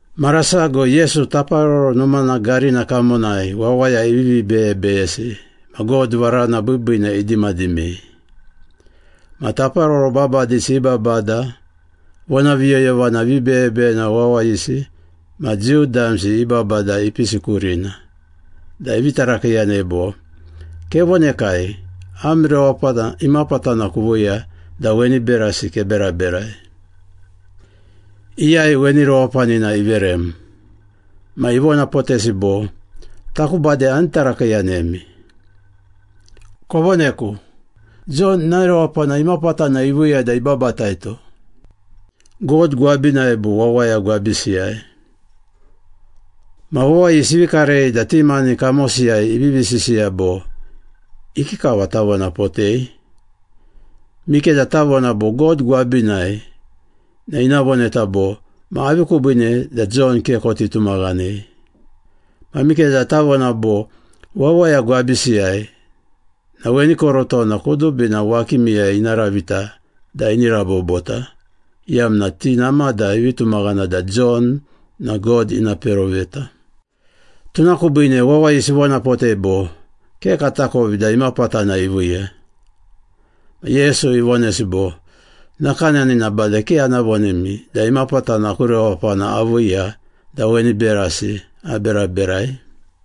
Mara sago Yesu Taparoro Numana garina kamonai wawaya ivivi beyebeyesi ma God varana biibiina idimadimei. Ma taparoro babadisi i babada, vonaviyoyovana vibeyebeyena wawayisi ma Jiu damsi i babada ipisi kurina, da ivi tarakiiyanei bo, “Kevonekai, am rewapana imapatana kuviiya da weni berasi keberaberai? Iyai weni rewapanina iverem?” Ma ivonapotesi bo, “Taku bade ani tarakiiyanemi. Kovoneku, Jon ina rewapana imapatana iviiya da ibabataito? God gwabinai bo wawaya gwabisiyai?” Ma wawayisi ivi karei da ti mani kamosiyai ivivi sisiya bo, “Ikikava tavonapotei? Mikeda tavona bo, ‘God gwabinai,’ na ina voneta bo, ‘Ma avi kubiine da Jon ke koti tumaghanei?’ Ma mikeda tavona bo, ‘Wawaya gwabisiyai,’ na weni korotona kudubina wakimiyai ina ravita da ini rabobota, iyamna ti namada ivi tumaghana da Jon na God ina peroveta.” Tuna kubiine wawayisi ivonapotei bo, “Ke katakovi da imapatana iviiya.” Ma Yesu ivonesi bo, “Nakanani na bade ke ana vonemi da imapatana aku rewapana aviiya da weni berasi aberaberai.”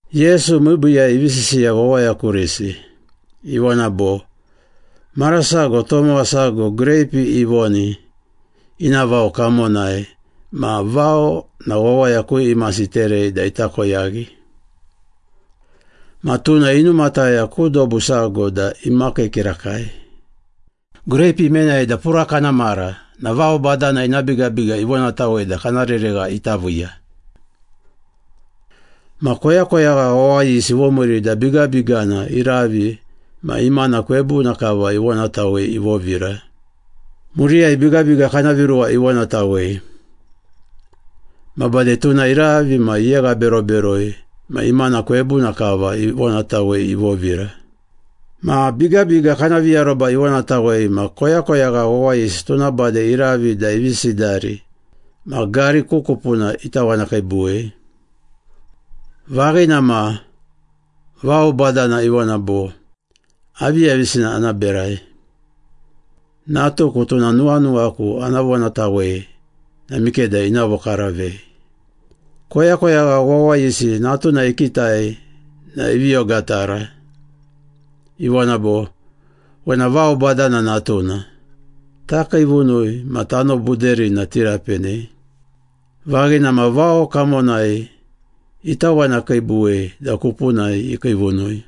Yesu miibiiyai ivi sisiya wawaya kurisi. Ivona bo, “Mara sago tomowa sago greipi ivoni ina vao kamonai ma vao na wawaya ku imasi iterei da ita koyaghi. Ma tuna inumataya ku dobu sago da imakii kirakai. Greipi imenai da pura kana mara na vao badana ina bigabiga ivonatawei da kana reregha ita viiya. Ma koyakoyagha wawayisi ivomiiri da bigabigana iravi ma imana kwebuna kava ivonatawei ivovira. Muriyai bigabiga kana viruwa ivonatawei. Ma bade tuna iravi ma iyeghaberoberoi ma imana kwebuna kava ivonatawei ivovira. Ma bigabiga kana viaroba ivonatawei ma koyakoyagha wawayisi tuna bade iravi da ivi sidari ma gari ku kupuna itawanakiibuwei. Vaghina ma, vao badana ivona bo, ‘Aviyavisina ana berai? Natuku, tuna nuwanuwaku ana vonatawei na mikeda ina vokaravei.’ Koyakoyagha wawayisi natuna ikitai na ivi ogatara. Ivona bo, ‘Wena vao badana natuna. Takiivunui ma tano buderina tirapenei.’ Vaghina ma, vao kamonai itawanakiibuwei da kupunai ikiivunui.”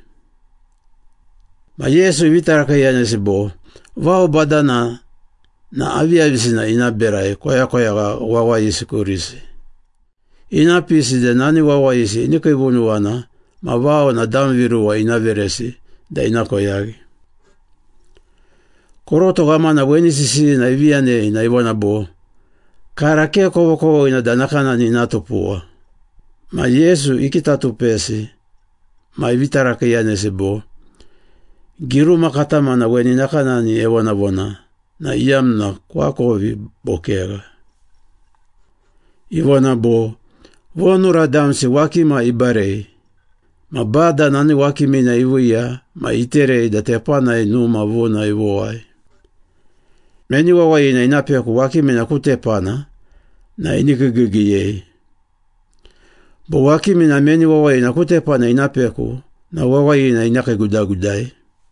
Ma Yesu ivi tarakiiyanesi bo, “Vao badana na aviyavisina ina berai koyakoyagha wawayisi kurisi? Ina pisi da nani wawayisi ini kiivunuwana ma vao na dam viruwa ina veresi da ina koyaghi.” Koroto ghamana weni sisiyina ivi yanei na ivona bo, “Kara ke kovokovoghina da nakanani ina tupuwa!” Ma Yesu ikitatupesi ma ivi tarakiiyanesi bo, “Giruma katamana weni nakanani evonavona na iyamna koakovi bo kegha? Ivona bo, ‘Vonura damsi wakima ibarei, Ma Bada nani wakimina iviiya ma iterei da tepanai numa vuna ivowai.’ Meni wawayina ina peku wakimina ku tepana na ini kiigiigiiyei. Bo wakimina meni wawayina ku tepana ina peku na wawayina ina kiigudagudai.”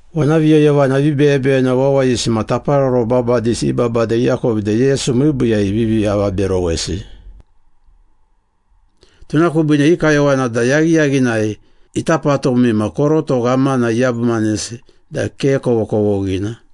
Vonaviyoyovana vibeyebeyena wawayisi ma taparoro babadisi i babada iakovi da Yesu miibiiyai ivivi avaberowesi. Tuna kubiine i kayowana da yaghiyaghinai ita patumi ma koroto ghamana iyabumanesi da ke kovokovoghina.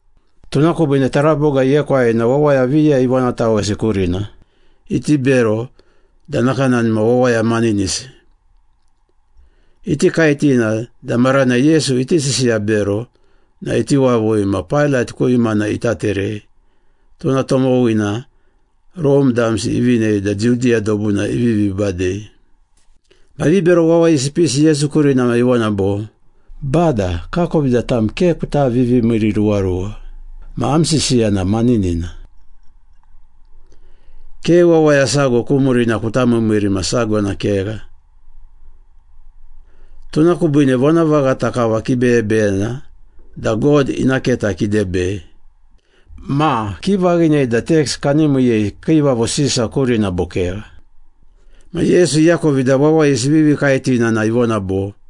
Tuna kubiine taraboga iekwai na wawaya viya ivonatawesi kurina, iti bero da nakanani ma wawaya maninisi. Iti kaetina da maranai Yesu iti sisiya bero na iti wavui ma Pailat ku imana ita terei, tuna tomowina Rome damsi ivinei da Judiya dobuna ivivi badei. Ma vibero wawayisi ipisi Yesu kurina ma ivona bo, “Bada, kakovi da tam ke kuta vivimiiriruwaruwa ma am sisiya na maninina. Ke wawaya sago ku murina kuta miimiiri ma sago na kegha, tuna kubiine vonavaghata kava kibeyebeyena da God ina keta kidebei. Ma, kivaghinei da teks kani miiyei Kiivavo Sisa kurina bo kegha?” Ma Yesu iakovi da wawayisi ivivi kaetina na ivona bo,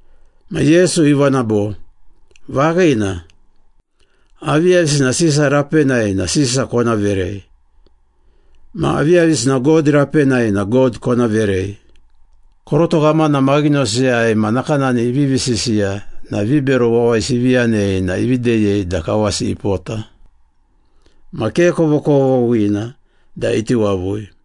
Ma Yesu ivona bo, “Vaghina. Aviyavisina Sisa rapenai na Sisa kona verei. Ma aviyavisina God rapenai na God kona verei.” Koroto ghamana maghinosiyai ma nakanani ivivi sisiya na vibero wawayisi ivi yanei na ivi deyei da kawasi ipota. Ma ke kovokovoghina da iti wavui.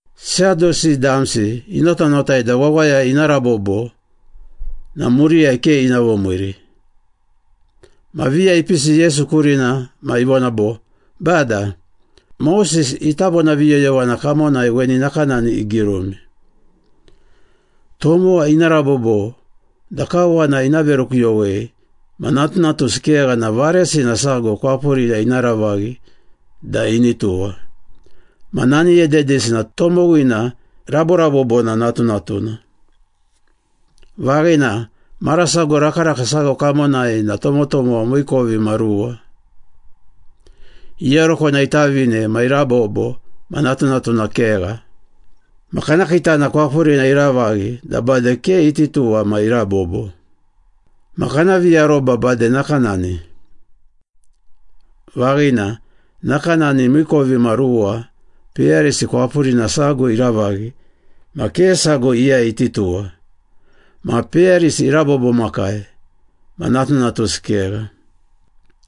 Sadusi damsi inotanotai da wawaya ina rabobo na muriyai ke ina vomiiri. Ma viya ipisi Yesu kurina ma ivona bo, “Bada, Moses ita vonaviyoyovana kamonai weni nakanani igirumi. ‘Tomowa ina rabobo da kawana ina verukuyowei ma natunatusi kegha na varesina sago kwapurina ina ravaghi da ini tuwa. Ma nani ededisi na tomowina raborabobona natunatuna.’” “Vaghina, mara sago rakaraka sago kamonai na tomotomowa miikovimaruwa. Iyarokona itavine ma irabobo ma natunatuna kegha. Ma kana kiitana kwapurina iravaghi da bade ke iti tuwa ma irabobo. Ma kana viaroba bade nakanani. Vaghina, nakanani miikovimaruwa peyarisi kwapurina sago iravaghi ma ke sago iyai iti tuwa, ma peyarisi irabobomakai ma natunatusi kegha.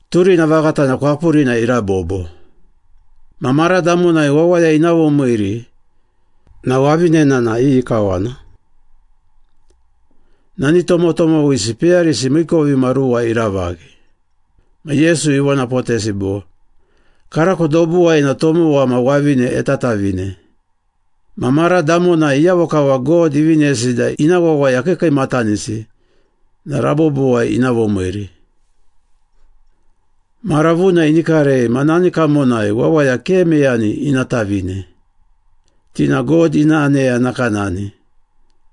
Turina vaghata na kwapurina irabobo. Ma mara damonai wawaya ina vomiiri na wavinena na iyi kawana? Nani tomotomowisi peyarisi miikovimaruwa iravaghi.” Ma Yesu ivonapotesi bo, “Karako dobuwai na tomowa ma wavine etatavine. Ma mara damonai iyavo kava God ivinesi da ina wawaya kiikiimatanisi na rabobowai ina vomiiri. Mara vuna ini karei ma nani kamonai wawaya ke meyani ina tavine. Ti na God ina aneya nakanani,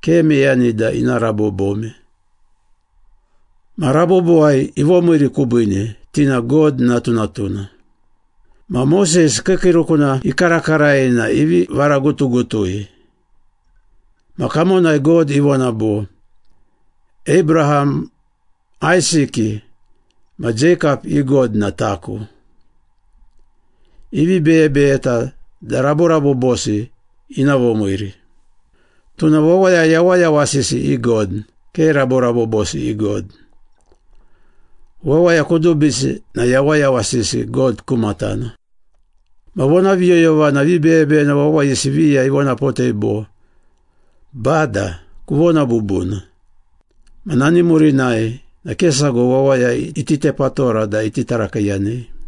ke meyani da ina rabobome. Ma rabobowai ivomiiri kubiine, ti na God natunatuna. Ma Moses kiikiirukuna ikarakarai na ivi varagutugutui. Ma kamonai God ivona bo, ‘Abraham, Aisiki, ma Jeikap i God na Taku.’ Ivi beyebeyeta da raborabobosi ina vomiiri. Tuna wawaya yawayawasisi i God, ke raborabobosi i God. Wawaya kudubisi na yawayawasisi God ku matana.” Ma vonaviyoyovana vibeyebeyena wawayisi viya ivonapotei bo, “Bada, kuvona bubuna.” Ma nani murinai na ke sago wawaya iti tepatora da iti tarakiiyanei.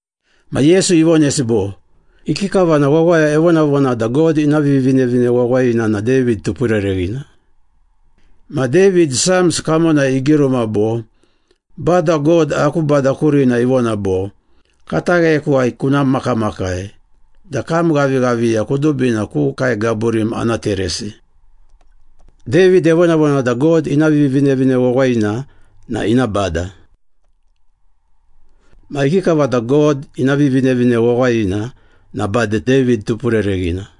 Ma Yesu ivonesi bo, “Ikikava na wawaya evonavona da God ina Vivinevine Wawayina na David tupurereghina? Ma David, Psalms kamonai igiruma bo, ‘Bada God aku Bada kurina ivona bo, Katagheyakuwai kuna makamakai da kam ghavighaviya kudubina ku kae gaburim ana teresi.’ David evonavona da God ina Vivinevine Wawayina na ina Bada. Ma ikikava da God ina Vivinevine Wawayina na bade David tupurereghina?”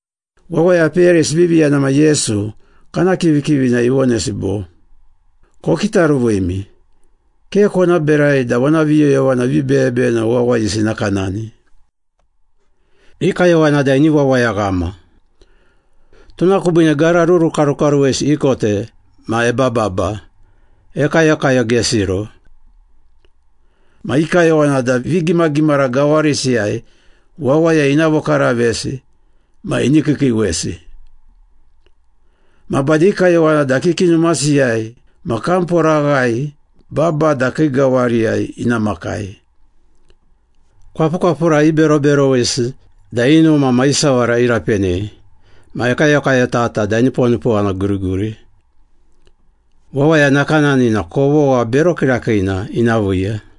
Wawaya peyarisi ivivi yana ma Yesu, kana kivikivina ivonesi bo, “Kokitaruvimi! Ke kona berai da vonaviyoyovana vibeyebeyena wawayisi nakanani. I kayowana da ini wawayaghama. Tuna kubiine gara rurukarukaruwesi ikote ma ebababa, ekayokayogesiro. Ma i kayowana da vigimagimara gawarisiyai wawaya ina vokaravesi ma ini kiikiiwesi. Ma bade i kayowana da kiki numasiyai ma kamporaghai babada kii gawariyai ina makai. Kwapukwapura iberoberowesi da i numa ma i sawara irapenei, ma ekayokayotata da eniponipowana guriguri. Wawaya nakanani na kovogha bero kirakiina ina viiya.”